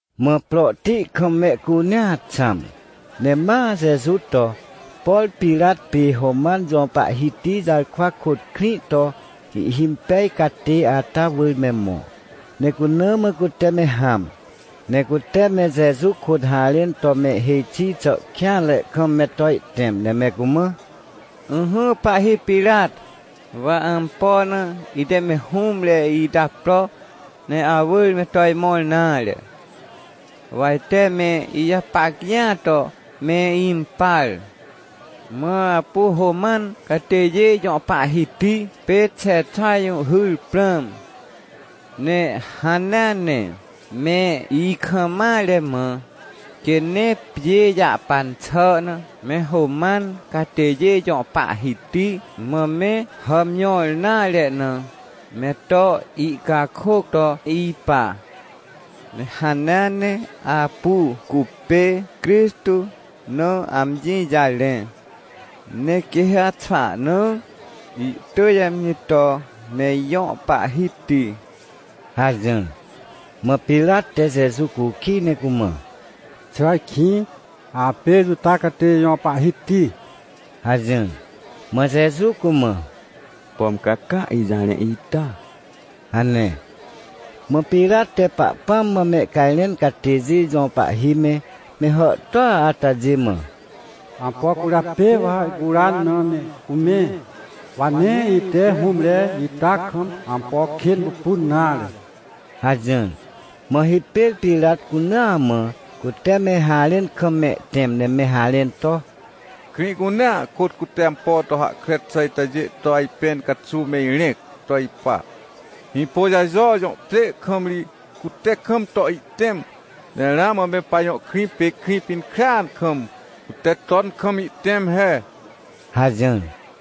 Mã prohti kam mehcunea xãm, ne ma Jeju to, por Pirat pê Roman jõ pahhiti jarkwa kôt krĩ to ihhimpej catê ata wỳr me mõ, ne cuna mã cute me hãm. Ne cute me Jeju kôt harẽn to me hêj xi xà kêanre kam me to ihtẽm, ne me cumã: ― Ỹhỹ pahhi Pirat, wa ampo na ite me hũmre ita pro ne awỳr me to imõr nare. Wa ite me ijapac jĩa to mempar, mã apu Roman catêjê jõ pahhiti pê Xexa jũhhyr prãm. Ne hanea ne, me ikam mare mã, quê nee pjê jahpan xà na me Roman catêjê jõ pahhiti mã me hàmjõr nare na, me to ihcakôc to ipa. Ne hanea ne apu cupê Crixtô na amji jarẽ, ne quê ha xwahna ihtỳj amji to me ijõ pahhiti ― hajỹr. Mã Pirat te Jeju cukij ne cumã: ― Xà ajkĩ apê Juta catêjê jõ pahhiti? ― hajỹr. Mã Jeju cumã: ― Pom ca caa ijarẽ ita? ― hane. Mã Pirat te Pahpãm mã mehcajrẽn catêjê jõ pahhi me, me hàhtôa atajê mã: ― Ampo cwỳrjapê wa ihcuran na me cumẽ? Wa nee ite hũmre ita kam ampo kên pupun nare ― hajỹr. Mã hipêr Pirat cunaa mã, cute me harẽn kam mehtẽm ne me harẽn to: ― Krĩ cunea kôt cute ampo to hahkre xà itajê to ajpẽn caxuw me irẽc to ipa. Hĩpôjajo jõ pjê kam ri cute kam to ihtẽm, ne ramã me pajõ krĩ pê Krĩpinkrêan kam, cute ton kam ihtẽm he ― hajỹr.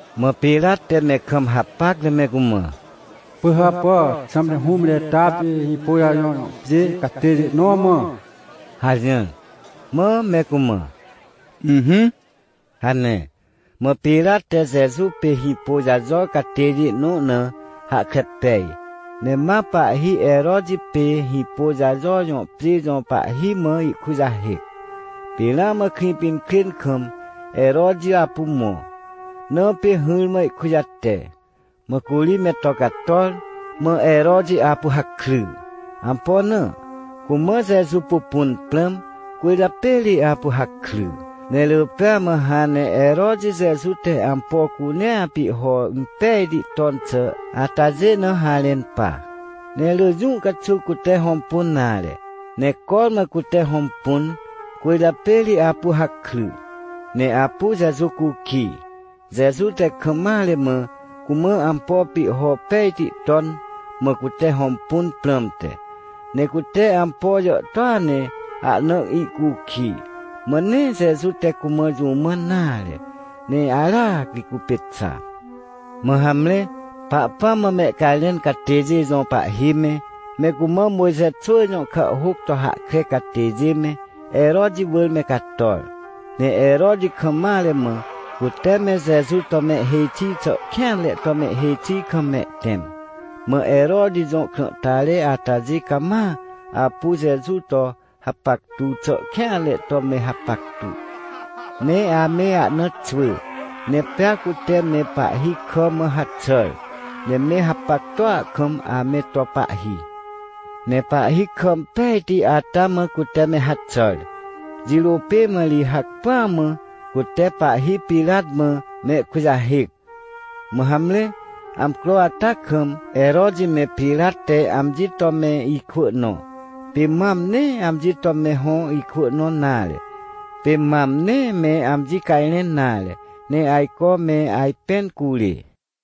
Mã Pirat te me kam hapac ne me cumã: ― Pỳhàpà, xãmte hũmre ita pê Hĩpôjajo jõ pjê catêjê nõ mã? ― hajỹr. Mã me cumã: ― Ỹhỹ ― hane. Mã Pirat te Jeju pê Hĩpôjajo catêjê nõ na hahkre pej, ne ma pahhi Heroti pê Hĩpôjajo jõ pjê jõ pahhi mã ihkujahêc. Pê ramã Krĩpinkrên kam Heroti apu mõ, na pê hỹrmã ihkujate. Mã curi me to cator, mã Heroti apu hakry. Ampo na? Cumã Jeju pupun prãm, cwỳrjapê ri apu hakry. Ne rỳ pêa mã hãn ne Heroti Jeju te ampo cunea pihho impejti ton xà atajê na harẽn pa. Ne rỳ jũ caxuw cute hõmpun nare, ne cormã cute hõmpun, cwỳrjapê ri apu hakry. Ne apu Jeju cukij, Jeju te kam mare mã cumã ampo pihho pejti ton, mã cute hõmpun prãmte. Ne cute ampo jàhtôa ne ahna ihcukij, mã nee Jeju te cumã jũ mãn nare, ne aracri cupê xa. Mã hamre, Pahpãm mã mehcajrẽn catêjê jõ pahhi me, me cumã Mojxe xwỳ jõ kàhhôc to hahkre catêjê me, Heroti wỳr me cator, ne Heroti kam mare mã cute me Jeju to mehhêj xi xà kêanre to mehhêj xi kam mehtẽm. Mã Heroti jõ krãhtare atajê cama apu Jeju to hapactu xà kêanre to me hapactu. Ne ame ahna xwỳ, ne pea cute me pahhi kà mã haxàr, ne me hapactua kam ame to pahhi. Ne pahhi kà impejti ata mã cute me haxàr, jirô pê mã ri hacpỹa mã cute pahhi Pirat mã mehkujahêc. Mã hamre, amcro ata kam, Heroti me Pirat te amji to me ikwỳ nõ. Pê mam nee amji to me hõ ikwỳ nõ nare. Pê mam nee me amji cajrẽn nare, ne ajco me ajpẽn curê.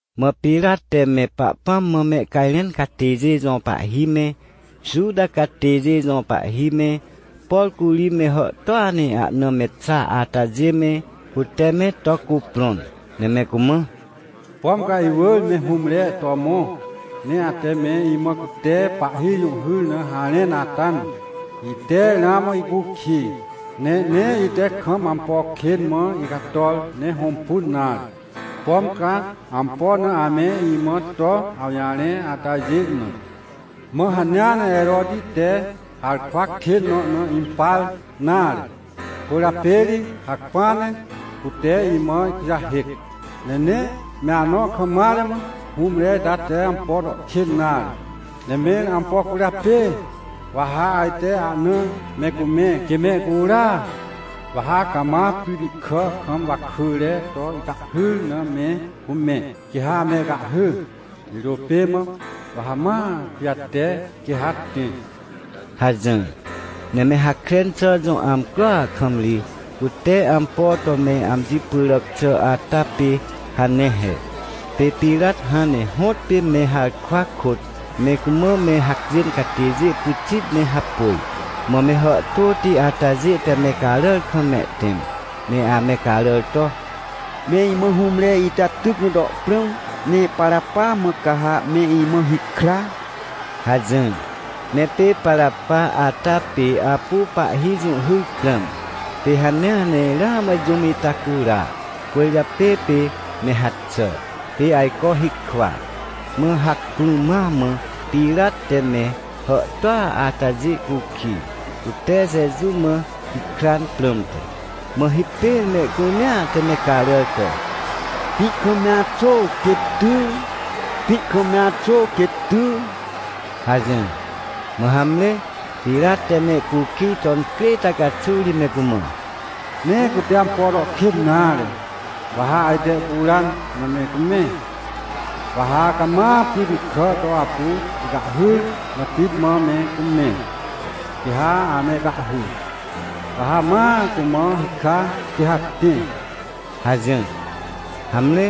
Mã Pirat te me Pahpãm mã mehcajrẽn catêjê jõ pahhi me, Juta catêjê jõ pahhi me, por curi me hàhtôa ne ahna me xa atajê me, cute me to cuprõn, ne me cumã: ― Pom ca iwỳr me hũmre to mõ, ne ate me imã cute pahhi jũhhyr na harẽn ata na, ite ramã ihcukij, ne nee ite kam ampo kên mã icator ne hõmpun nare, pom ca ampo na ame imã to awjarẽ atajê na. Mã hanea ne Heroti te harkwa kên nõ na impar nare, cwỳrjapê ri hacpỹa ne cute imã ihkujahêc. Ne nee me anõ kam mare mã hũmre ita te ampo to kên nare. Ne mẽr ampo cwỳrjapê wa ha ajte ahna me cumẽ, quê mehcura? Wa ha cama pryti kà kam wakỳre to ihcahhyr na me cumẽ, quê ha amehcahhy, jirô pê mã wa ha ma ihkujate, quê ha tẽ ― hajỹr. Ne me Hakren xà jõ amcroa kam ri cute ampo to me amji pyràc xà ata pê hane he. Pê Pirat hãn ne hõtpê me harkwa kôt me cumã me hacjên catêjê pyxit ne hapôj. Mã me hàhtôti atajê te me caràr kam mehtẽm, ne ame caràr to: ― Me imã hũmre ita tyc na to prãm, ne Parapa mã ca ha me imã hikra ― hajỹr. Ne pê Parapa ata pê apu pahhi jũhhyr prãm, pê hanea ne ramã jũm ita cura, cwỳrjapê pê me haxà, pê ajco hikwa. Mã hacpỹ ma mã Pirat te me hàhtôa atajê cukij, cute Jeju mã hikran prãmte. Mã hipêr mehcunea te me caràr to: ― Pĩ kam me axô, quê ty! Pĩ kam me axô, quê ty! ― hajỹr. Mã hamre, Pirat te mehcukij to incrê ita caxuw ri me cumã: ― Nee cute ampo to kên nare, wa ha ajte ihcuran na me cumẽ. Wa ha cama pryti kà to apu ihcahhyr na pit mã me cumẽ, quê ha amehcahhy, wa ha ma cumã hikra, quê ha tẽ ― hajỹr. Hamre,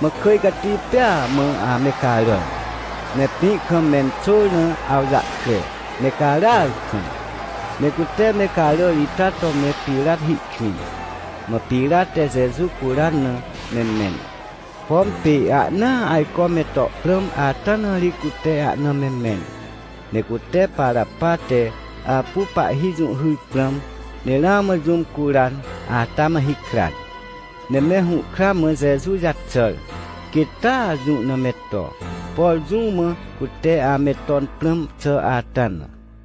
mã kỳj cati pêa mã ame caràr, ne pĩ kam menxôr na awjahkre, me caràar kam. Ne cute me caràr ita to me Pirat hi kwĩn. Mã Pirat te Jeju curan na me mẽn. Pom pê ahnaa ajco me to prãm ata na ri cute ahna me mẽn. Ne cute Parapa te apu pahhi jũhhyr prãm, ne ramã jũm curan ata mã hikran. Ne me hũhkra mã Jeju jaxàr, quêt taa jũ na me to, por jũ mã cute ame ton prãm xà ata na.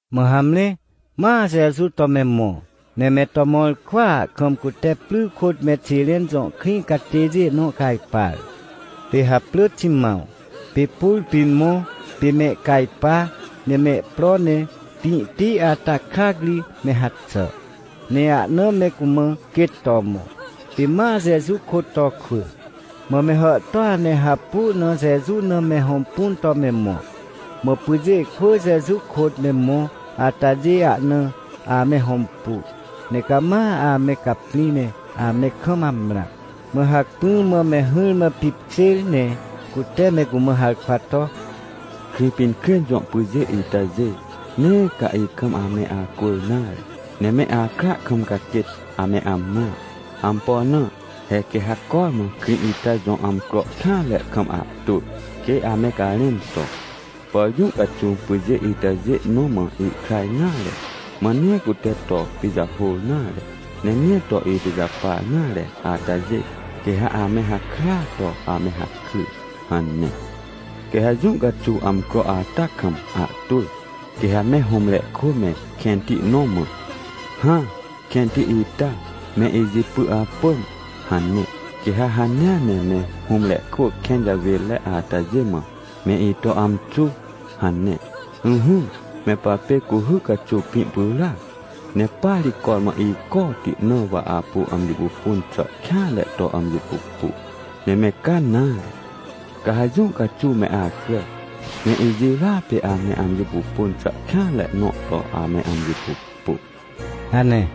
Mã hamre, ma Jeju to me mõ. Ne me to mõr kwỳa kam cute pry kôt me Xiren jõ krĩ catêjê nõ cajpar, pê haprỳ Ximãw. Pê pur pĩn mõ, pê mehcajpa ne mehpro ne pĩhti ata krac ri me haxà, ne ahna me cumã quêt to mõ, pê ma Jeju kôt to kwỳ. Mã me hàhtôa ne hapu na Jeju na me hõmpun to me mõ. Mã pyjê kwỳ Jeju kôt me mõ atajê ahna ame hõmpu, ne cama ame caprĩ ne ame kam amrã. Mã hacpỹ mã me hỹrmã pipkjêr, ne cute me cumã harkwa to: ― Krĩpinkrên jõ pyjê itajê, nee ca ikam ame acwỳr nare, ne me akra kam ca quêt ame amrã. Ampo na? He quê ha cormã krĩ ita jõ amcro kêanre kam ahtwỳ, quê ame garẽn to: “Por jũ caxuw pyjê itajê nõ mã ihkra nare, mã nee cute to pijahôr nare, ne nee to ipijapar nare atajê, quê ha ame hakrya to ame hakry” hane. Quê ha jũ caxuw amcro ata kam ahtwỳ, quê ha me hũmre kwỳ me kẽnti nõ mã: “Hã, kẽnti ita me ijipy apỳm” hane. ― Quê ha hanea ne me hũmre kwỳ kẽn jawênre atajê mã: “Me ito amxu” hane. Ỹhỹ, me papê cuhy caxuw pĩ pyràac, ne pa ri cormã icoti na wa apu amji pupun xà kêanre to amji pupu. Ne me ca nare, ca ha jũ caxuw me acrà, ne ijirôa pê ame amji pupun xà kêanre nõ to ame amji pupu ― hane.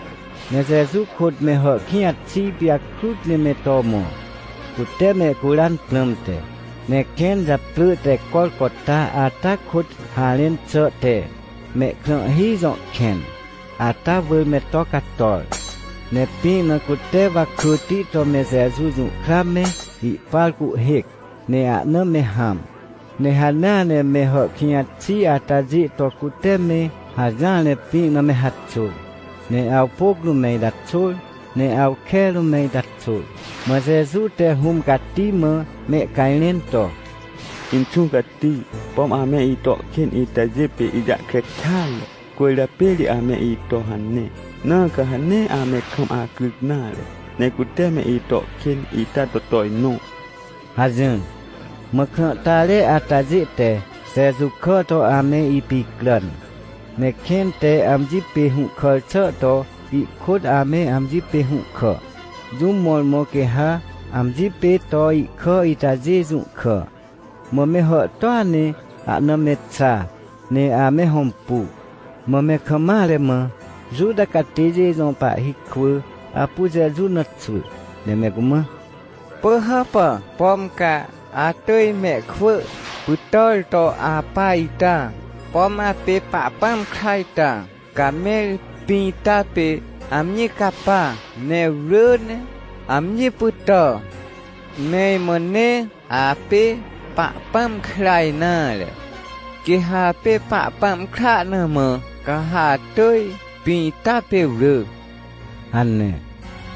Ne Jeju kôt me hàhkĩj xi pijakrut ne me to mõ, cute mehcuran prãmte. Ne kẽn japrỳ te Corcota ata kôt harẽn xà te “Mehkrãhhi jõ kẽn” ata wỳr me to cator. Ne pĩ na cute wakỳti to me Jeju jũhkra me ihpar cuhhêc, ne ahna me hãm. Ne hanea ne me hàhkĩj xi atajê to cute me hajỹar ne pĩ na me haxôr, ne awpôc rũm me ita xôr, ne awke rũm me ita xôr. Mã Jeju te Hũm Cati mã mehcajrẽn to: ― Inxũ Cati, pom ame ito kên itajê pê ijahkre kêatre, cwỳrjapê ri ame ito hane, na ca ha nee ame kam acryc nare, ne cute me ito kên ita to tojnõ ― hajỹr. Mã krãhtare atajê te Jeju kà to ame ipicràn, ne kẽn te amji pê hũhkàr xà to ihkôt ame amji pê hũhkà, jũm mõrmõ quê ha amji pê to ihkà itajê jũhkà. Mã me hàhtôa ne ahna me xa, ne ame hõmpu. Mã me kam mare mã, Juta catêjê jõ pahhi kwỳ apu Jeju na xwỳ, ne me cumã: ― Pỳhàpà, pom ca atỳj mehkwỳ pytàr to apa ita? Pom apê Pahpãm kra ita, ca mẽr pĩ ita pê amji capa ne wrỳ ne amji pytà. Me imã nee apê Pahpãm kra nare. Quê ha apê Pahpãm kra na mã, ca ha atỳj pĩ ita pê wrỳ ― hane.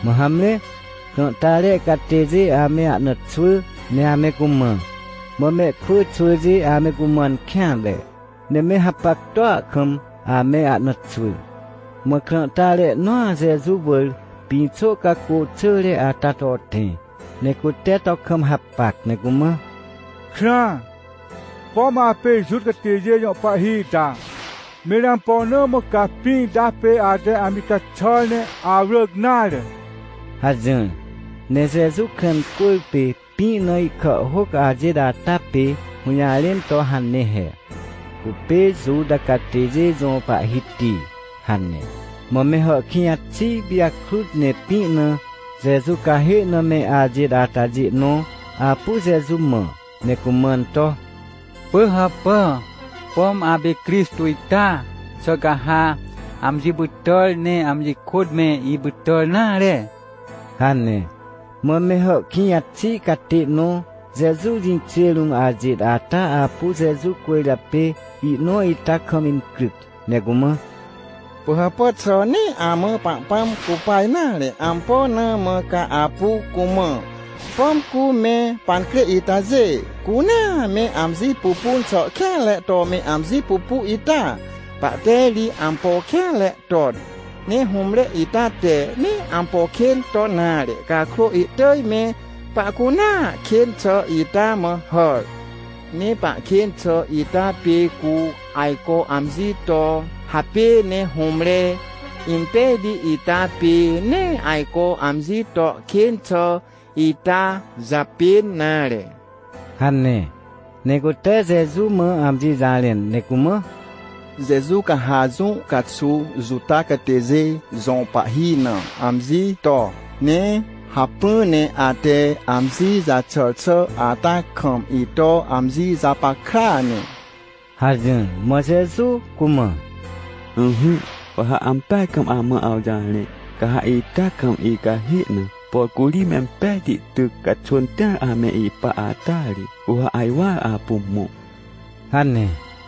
Mã hamre, krãhtare catêjê ame ahna xwỳ ne ame cumã. Mã mehkwỳ xwỳjê ame cumãn kêanre, ne me hapactua kam ame ahna xwỳ. Mã krãhtare nõa Jeju wỳr pĩxô cacô xỳre ata to tẽ, ne cute to kam hapac, ne cumã: ― Krãa, pom apê Juta catêjê jõ pahhi ita, mẽr ampo na mã ca pĩ ita pê ate amji caxàr ne awrỳc nare? ― hajỹr. Ne Jeju krã incwỳrpê pĩ na ihkàhhôc ajêt ata pê hũjarẽn to hane he: “Cupê Juta Catêjê Jõ Pahhiti” hane. Mã me hàhkĩj xi pijakrut ne pĩ na Jeju cahê na me ajêt atajê nõ apu Jeju mã, ne cumãn to: ― Pỳhàpà, pom apê Crixtô ita? Xà ca ha amji pytàr ne amji kôt me ipytàr nare? ― hane. Mã me hàhkĩj xi catê nõ Jeju jĩkjê rũm ajêt ata apu Jeju cwỳrjapê ihnõ ita kam incryc, ne cumã: ― Pỳhàpà, xà nee amã Pahpãm cupa nare? Ampo na mã ca apu cumã? Pom cu me pancrê itajê cunea me amji pupun xà kêanre to me amji pupu ita? Pahte ri ampo kêanre ton, ne hũmre ita te nee ampo kên ton nare cakrô, ihtỳj me pahcunea kên xà ita mã hàr. Ne pahkên xà ita pê cu ajco amji to hapê, ne hũmre impejti ita pê nee ajco amji to kên xà ita japên nare ― hane. Ne cute Jeju mã amji jarẽn, ne cumã: ― Jeju, ca ha jũ caxuw Juta catêjê jõ pahhi na amji to, ne hacpỹ ne ate amji jaxàr xà ata kam, ito amji japackrea ne ― hajỹr. Mã Jeju cumã: ― Ỹhỹ, wa ha ampeaj kam amã awjarẽ, ca ha ita kam icahê na, por curi mempejti tyc caxwỳn tĩar ame ipa ata ri, cu ha ajwar apu mõ ― hane.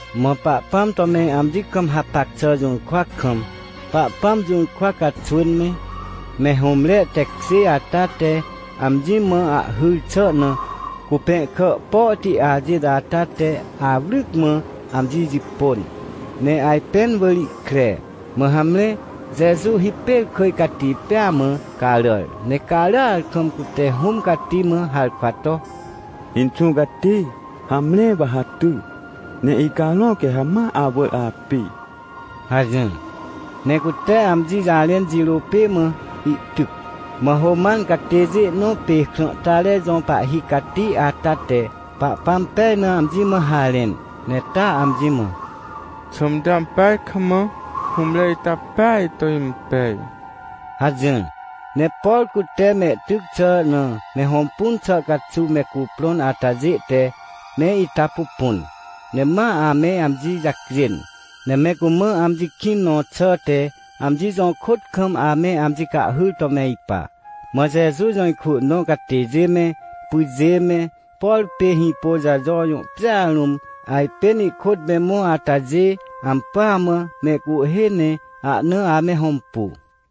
Mã Pahpãm to me amji kam hapac xà jũrkwa kam Pahpãm jũrkwa caxwỳn me, me hũmre tekjê ata te amji mã ahhyr xà na, cupẽhkà pohti ajêt ata te awryc mã amji jipôn, ne ajpẽn wỳr ihkre. Mã hamre, Jeju hipêr kỳj cati pêa mã caràr, ne caràar kam cute Hũm Cati mã harkwa to: ― Inxũ Cati, hamre, wa ha ty, ne icarõ quê ha ma awỳr api ― hajỹr. Ne cute amji jarẽn jirô pê mã ihtyc. Mã Roman catêjê nõ pê krãhtare jõ pahhi cati ata te Pahpãm pej na amji mã harẽn, ne taa amji mã: ― Xãmte ampeaj kam hũmre ita peaj to impej ― hajỹr. Ne por cute mehtyc xà na me hõmpun xà caxuw me cuprõn atajê te me ita pupun, ne ma ame amji jacjên, ne me cumã amji kĩn nõ xàhte, amji jõkôt kam ame amji cahhyr to me ipa. Mã Jeju jõ ikwỳ nõ catêjê me, pyjê me, por pê Hĩpôjajo jõ pjêa rũm ajpên ihkôt me mõ atajê, ampỳa mã mehcuhhê ne ahna ame hõmpu.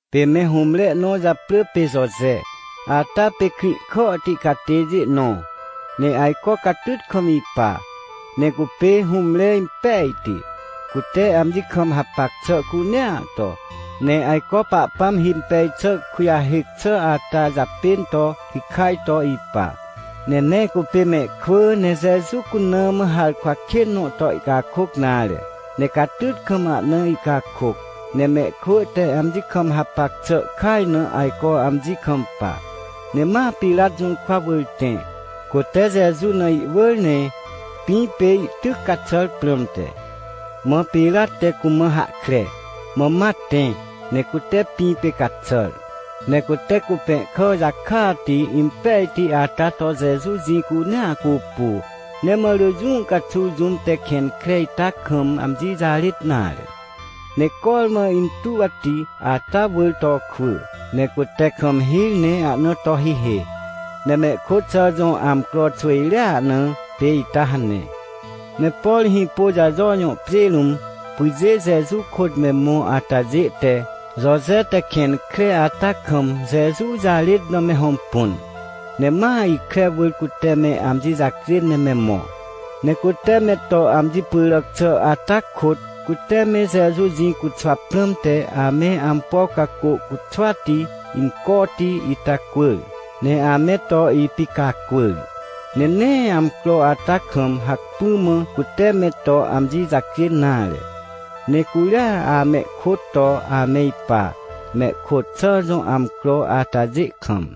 Pê me hũmre ihnõ japrỳ pê Joje, ata pê Krĩhkàhti catêjê nõ, ne ajco catyt kam ipa. Ne cupê hũmre impejti, cute amji kam hapac xà cunea to, ne ajco Pahpãm himpej xà kujahêc xà ata japên to hikaj to ipa. Ne nee cupê mehkwỳ, ne Jeju cuna mã harkwa kên nõ to ihcakôc nare, ne catyt kam ahna ihcakôc, ne mehkwỳ te amji kam hapac xà kaj na ajco amji kampa. Ne ma Pirat jũrkwa wỳr tẽ, cute Jeju na ihwỳr, ne pĩ pê ihtyc caxàr prãmte. Mã Pirat te cumã hahkre, mã ma tẽ ne cute pĩ pê caxàr. Ne cute cupẽhkà jakati impejti ata to Jeju jĩ cunea cupu, ne ma rỳ jũ caxuw jũm te kẽn kre ita kam amji jarêt nare, ne cormã intuwti ata wỳr to kwỳ, ne cute kam hir, ne ahna to hihê. Ne mehkôt xà jõ amcro xwỳjrea na pê ita hane. Ne por Hĩpôjajo jõ pjê rũm, pyjê Jeju kôt me mõ atajê te Joje te kẽn kre ata kam Jeju jarêt na me hõmpun. Ne ma ikre wỳr cute me amji jacjên ne me mõ. Ne cute me to amji pyràc xà ata kôt, cute me Jeju jĩ cuxwa prãmte ame ampo cacô cuxwati, incoti ita cwỳr, ne ame to ipicacwỳr. Ne nee amcro ata kam hacpỹ mã cute me to amji jacjên nare, ne curia amehkôt to ame ipa, mehkôt xà jõ amcro atajê kam.